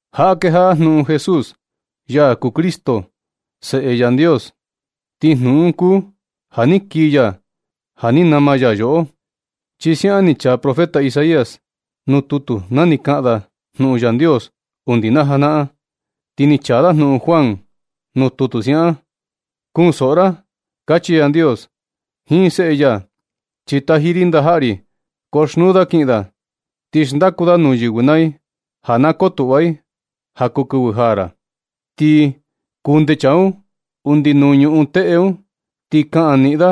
Jaꞌa kejaꞌa jnuꞌun Jesús, ya kuu Cristo, Seꞌe Yandios. Ti jnuꞌun un kuu ja ni kii ya ja ni nama ya yoꞌo. Chi siaꞌan ni chaa profeta Isaías tutu, na ni kaꞌan da jnuꞌun Yandios undi na janaꞌan. Ti ni chaa da jnuꞌun Juan nuu tutu siaꞌan: “Kunsoꞌo ra”, kachi Yandios jiin Seꞌe ya, chi taji ri ndajaꞌa ri. Koxnuu da kiꞌin da, ti xndaku da nuu yɨvɨ naa i, ja na kotuꞌva i ja kuu kɨvɨ jaa ra. Ti kunde chaa un undi nuu ñuꞌun teꞌe un, ti kaꞌan niꞌin da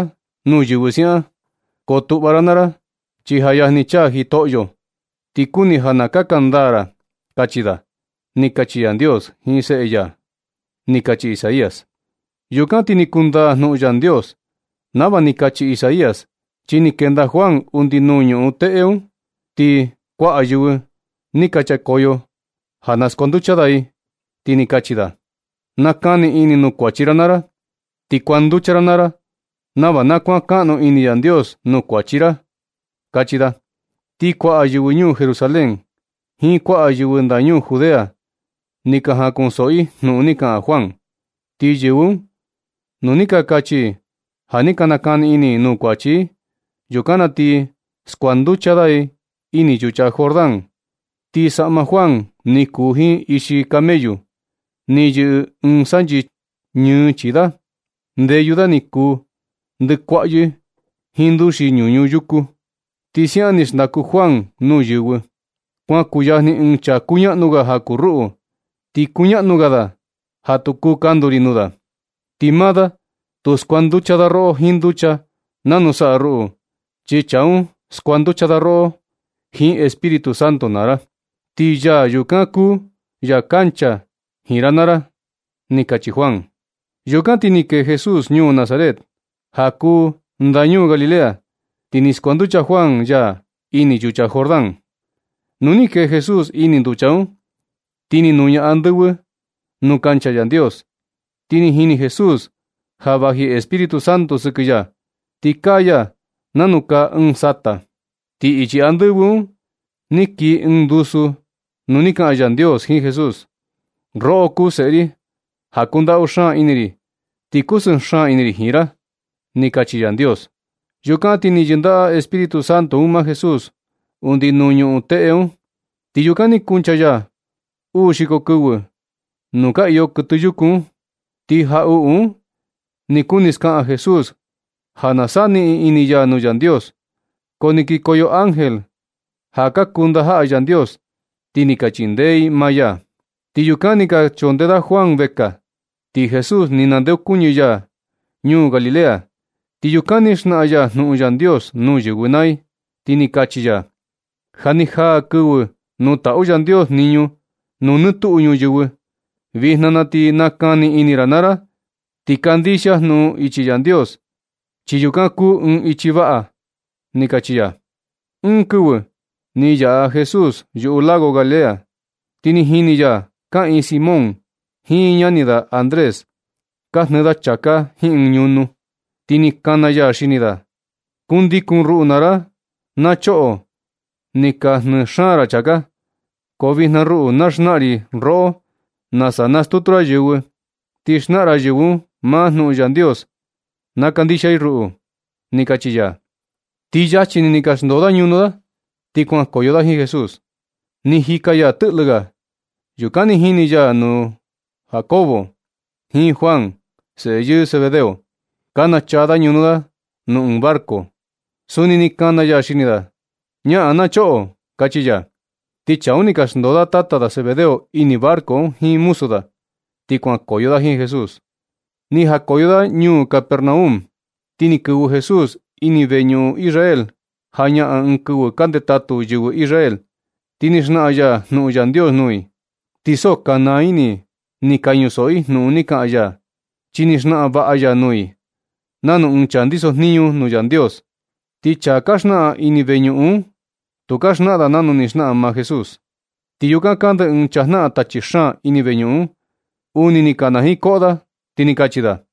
nuu yɨvɨ siaꞌan: “Kotuꞌva ra naa ra, chi ja yajni chaa Jitoꞌyo. Ti kuni ja na kaka ndaa ra”, kachi da, ni kachi Yandios jiin Seꞌe ya. Ni kachi Isaías. Yukan ti ni kundaa jnuꞌun Yandios nava ni kachi Isaías, chi ni kenda Juan undi nuu ñuꞌun teꞌe un. Ti kuaꞌa yɨvɨ vekoyo ja na skuanducha da i, ti ni kachi da: ―Nakani ini nuu kuachi ra naa ra, ti kuanducha naa ra nava na kuankaꞌnu ini Yandios nuu kuachi ra ―kachi da. Ti kuaꞌa yɨvɨ ñuu Jerusalén jiin kuaꞌa yɨvɨ ndañuu Judea ni ka jaꞌan kunsoꞌo i jnuꞌun ni kaꞌan Juan. Ti yɨvɨ un, nu ni ka kachi i ja ni ka nakani ini i nuu kuachi i, yukan na ti skuanducha da i ini yucha Jordán. Ti saꞌma Juan ni kuu jiin ixi camellu. Ni yɨꞌɨ ɨɨn sanchi ñɨɨ chii da. Ndeyu da ni kuu ndɨkuaꞌyɨ jiin nduxi ñuñu yuku. Ti siaꞌan ni xndaku Juan nuu yɨvɨ: ―Kuan kuyajni ɨɨn chaa kuñaꞌnu ga ja kuu ruꞌu. Ti kuñaꞌnu ga da ja tu kuu kandu ri nuu da. Ti maa da tu skuanducha da roꞌo jiin nducha nanu saꞌa ruꞌu, chi chaa un skuanducha da roꞌo jiin Espíritu Santo naa ra. Ti yaa yukan kuu ya kuncha jiin ra naa ra ―ni kachi Juan. Yukan ti ni kee Jesús ñuu Nazaret, ja kuu ndañuu Galilea. Ti ni skuanducha Juan ya ini yucha Jordán. Nu ni kee Jesús ini nducha un, ni ti nuña andɨvɨ nuu kancha Yandios, ti ni jini Jesús ja vaji Espíritu Santo sɨkɨ ya, ti kaa ya nanu kaa ɨɨn sata. Ti ichi andɨvɨ un ni kii ɨɨn ndusu nu ni kaꞌan Yandios jiin Jesús: ―Roꞌo kuu Seꞌe ri ja kundaꞌu xaan ini ri, ti kusɨɨ xaan ini ri jiin ra ―ni kachi Yandios. Yukan ti ni yɨndaꞌa Espíritu Santo un maa Jesús undi nuu ñuꞌun teꞌe un. Ti yukan ni kuncha ya uu xiko kɨvɨ nuu ka iyo kɨtɨ yuku un. Ti jaꞌuꞌu un ni kuni skaꞌan Jesús ja na saniꞌin ini ya nuu Yandios. Ko ni kikoyo ángel, ja ka kuu ndajaꞌa Yandios, ti ni ka chindee i maa ya. Ti yukan ni ka chondee da Juan vekaa, ti Jesús ni nandeokuñɨ ya ñuu Galilea. Ti yukan ni xnaꞌan ya jnuꞌun Yandios nuu yɨvɨ naa i, ti ni kachi ya: ―Ja ni jaa kɨvɨ nuu taꞌu Yandios jniñu nuu nɨ tuꞌu ñuyɨvɨ. Vijna na ti nakani ini naa ra ti kandixia jnuꞌun ichi Yandios, chi yukan kuu ɨɨn ichi vaꞌa ―ni kachi ya. Ɨɨn kɨvɨ ni yaꞌa Jesús yuꞌu lago Galilea, ti ni jini ya kaꞌiin Simón jiin ñani da Andrés, ka jnɨɨ da chāká jiin ɨɨn ñunu, ti ni kana ya xini da: ―Kundikun ruꞌu naa ra, na choꞌo. Ni ka jnɨɨ xaan ra chāká, ko vijna ruꞌu na xnaꞌan ri roꞌo nasa nastutu ra yɨvɨ, ti xnaꞌan ra yɨvɨ un maa jnuꞌun Yandios kandixia i ruꞌu ―ni kachi ya. Ti luego ni, ni ka xndoo da ñunu da, ti kuankoyo da jiin Jesús. Ni jika ya tɨꞌlɨ ga. Yukan ni jini ya nuu Jacobo jiin Juan, seꞌe yɨɨ Zebedeo, ka nachaa da ñunu da nuu ɨɨn barco. Suni ni kana ya xini da: ―Ñaꞌan na choꞌo ―kachi ya. Ti chaa un ni ka xndoo da tata da Zebedeo ini barco un jiin muzu da, ti kuankoyo da jiin Jesús. Ni jakoyo da ñuu Capernaum. Ti ni kɨvɨ Jesús ini veñuꞌun Israel jañaꞌan ɨɨn kɨvɨ ka ndetatu yɨvɨ Israel. Ti ni xnaꞌan ya jnuꞌun Yandios nuu i. Ti so ka naa ini i ni ka ñusoꞌo i jnuꞌun ni kaꞌan ya, chi ni xnaꞌan vaꞌa ya nuu i, nanu ɨɨn chaa ndiso jniñu nuu Yandios. Ti chaa ka xnaꞌan ini veñuꞌun un, tu ka xnaꞌan da nanu ni xnaꞌan maa Jesús. Ti yukan kande ɨɨn chaa jnaꞌan tachi xaan ini veñuꞌun un, uni ni kanajiin koꞌo da, ti ni kachi da: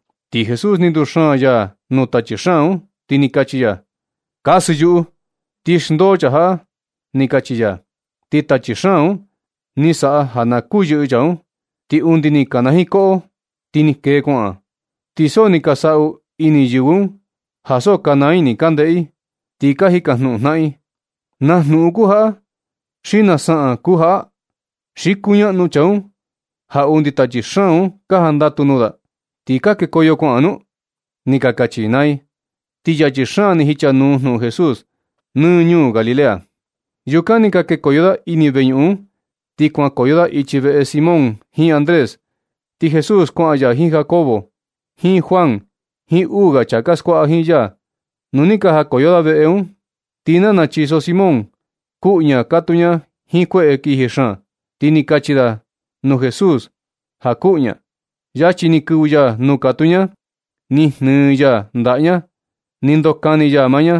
Ti Jesús ni nduxaan ya nuu tachi xaan un, ti ni kachi ya: ―Kasɨ yuꞌu, ti xndoo chaa jaꞌa ―ni kachi ya. Ti tachi xaan un ni saꞌa ja na kuyɨꞌɨ chaa un, ti undi ni kanajiin koꞌo ti ni kee kuaꞌan. Ti so ni ka saꞌu ini yɨvɨ un ja so ka naa ini ka ndeꞌe i, ti ka jikajnuꞌun jnaꞌan i: ―¿Na jnuꞌun kuu jaꞌa, xi na saꞌan kuu jaꞌa? ¿Xi kuñaꞌnu chaa un ja undi tachi xaan un ka jandatu nuu da, ti ka kekoyo kuaꞌan nu? ―ni kachi i naa i. Ti yachi xaan ni jichanuu jnuꞌun Jesús nɨ ñuu Galilea. Yukan ni ka kekoyo da ini veñuꞌun un, ti kuankoyo da ichi veꞌe Simón jiin Andrés. Ti Jesús kuaꞌan ya jiin Jacobo jiin Juan jiin uu ga chaa ka skuaꞌa jiin ya, nu ni ka jakoyo da veꞌe un. Ti nana chiso Simón kuꞌu ña. Katuu ña jiin kueꞌe kiji xaan, ti ni ka kachi da nuu Jesús ja kuꞌu ña. Luego ni kɨvɨ ya nuu katuu ña. Ni jnɨɨ ya ndaꞌa ña, ni ndokani ya maa ña,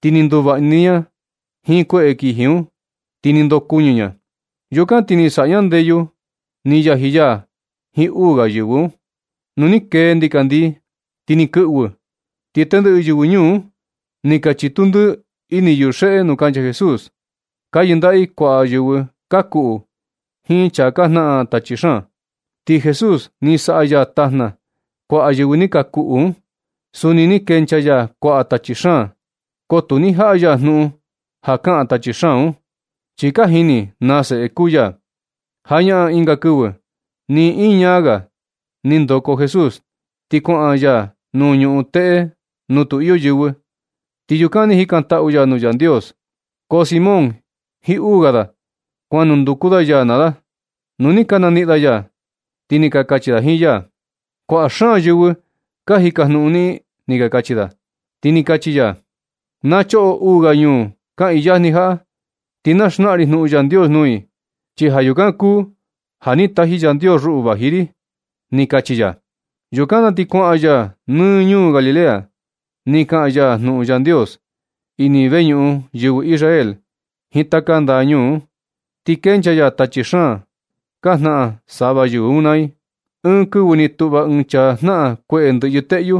ti ni nduvaꞌa ni ña jiin kueꞌe kiji un, ti ni ndokuɨñɨ ña. Yukan ti ni saꞌa ña ndeyu ni yaji ya jiin uu ga yɨvɨ un. Nu ni kee ndikandii ti ni kɨꞌvɨ, ti tendɨꞌɨ yɨvɨ ñuu un, ni ka chitu ndɨɨ nɨ yuxeꞌe nuu kancha Jesús. Ka yɨndaꞌa i kuaꞌa yɨvɨ ka kuꞌu jiin chaa ka jnaꞌan tachi xaan. Ti Jesús, ni saꞌa ya tajna kuaꞌa yɨvɨ ka kuꞌu un. Suni ni kenchaa ya kuaꞌa tachi xaan. Ko tu ni jaꞌa ya jnuꞌun ja kaꞌan tachi xaan un, chi ka jini na seꞌe kuu ya. Jañaꞌan ɨnga kɨvɨ, ni iñaa ga, ni ndoko Jesús ti kuaꞌan ya nuu ñuꞌun teꞌe nuu tu iyo yɨvɨ. Ti yukan ni jikantaꞌu ya nuu Yandios. Ko Simón jiin uu ga da, kuan nunduku da ya naa da. Nu ni ka naniꞌin da ya, ti ni ka kachi da jiin ya: ―Kuaꞌa xaan yɨvɨ ka jikajnuꞌun niꞌin ―ni ka kachi da. Ti ni kachi ya: ―Na choꞌo uu ga ñuu kaꞌiin yajni jaꞌa, ti na xnaꞌan ri jnuꞌun Yandios nuu i. Chi ja yukan kuu ja ni taji Yandios ruꞌu vaji ri ―ni kachi ya. Yukan na ti kuaꞌan ya nɨ ñuu Galilea, ni kaꞌan ya jnuꞌun Yandios ini veñuꞌun yɨvɨ Israel jiin taka ndaꞌa ñuu un, ti kenchaa ya tachi xaan ka jnaꞌan sava yɨvɨ un naa i. Ɨɨn kɨvɨ ni tuꞌva ɨɨn chaa jnaꞌan kueꞌe ndɨꞌyɨ teꞌyu.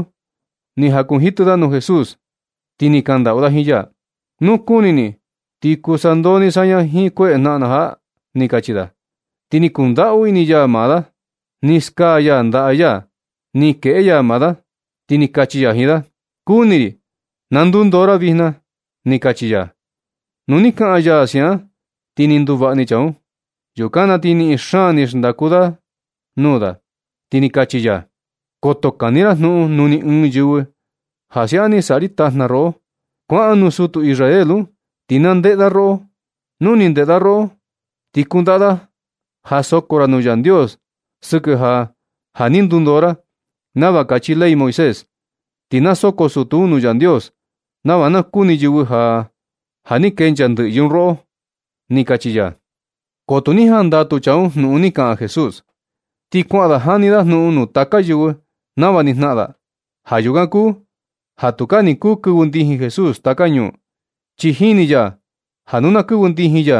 Ni jakunjitɨ da nuu Jesús, ti ni kandaꞌu da jiin ya: ―Nu kuni ni, ti kuu sandoo ni saña jiin kueꞌe jnaꞌan na jaꞌa―ni kachi da. Ti ni kundaꞌu ini ya maa da, ni skaa ya ndaꞌa ya, ni kueꞌe ya maa da, ti ni kachi ya jiin da: ―Kuni ri, na ndundoo ra vijna ―ni kachi ya. Nu ni kaꞌan ya siaꞌan, ti ni nduvaꞌa ni chaa un. Yukan na ti niꞌin xaan ni xndaku ya nuu da, ti ni kachi ya: ―Koto kani ra jnuꞌun nuu ni ɨɨn yɨvɨ ja siaꞌan ni saꞌa ri tajna roꞌo. Kuaꞌan nuu sutu Israel un, ti na ndeꞌe da roꞌo. Nu ni ndeꞌe da roꞌo, ti kundaꞌa ja soko ra nuu Yandios sɨkɨ ja, ja ni ndundoo ra, nava kachi ley Moisés. Ti na soko sutu un nuu Yandios, nava na kuni yɨvɨ ja, ja ni kenchaa ndɨꞌyɨ un roꞌo ―ni kachi ya. Ko tu ni jandatu chaa un jnuꞌun ni kaꞌan Jesús. Ti kuaꞌan da, jani da jnuꞌun nuu taka yɨvɨ nava ni jnaꞌan da. Ja yukan kuu ja tukaa ni kuu kɨvɨ ndijin Jesús taka ñuu, chi jini ya ja nu na kɨvɨ ndijin ya,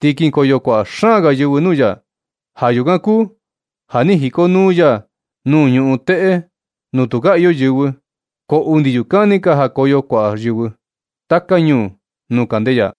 ti kinkoyo kuaꞌa xaan ga yɨvɨ nuu ya. Ja yukan kuu ja ni jikonuu ya nuu ñuꞌun teꞌe nuu tukaa iyo yɨvɨ, ko undi yukan ni ka kikoyo kuaꞌa yɨvɨ taka ñuu nuu kande ya.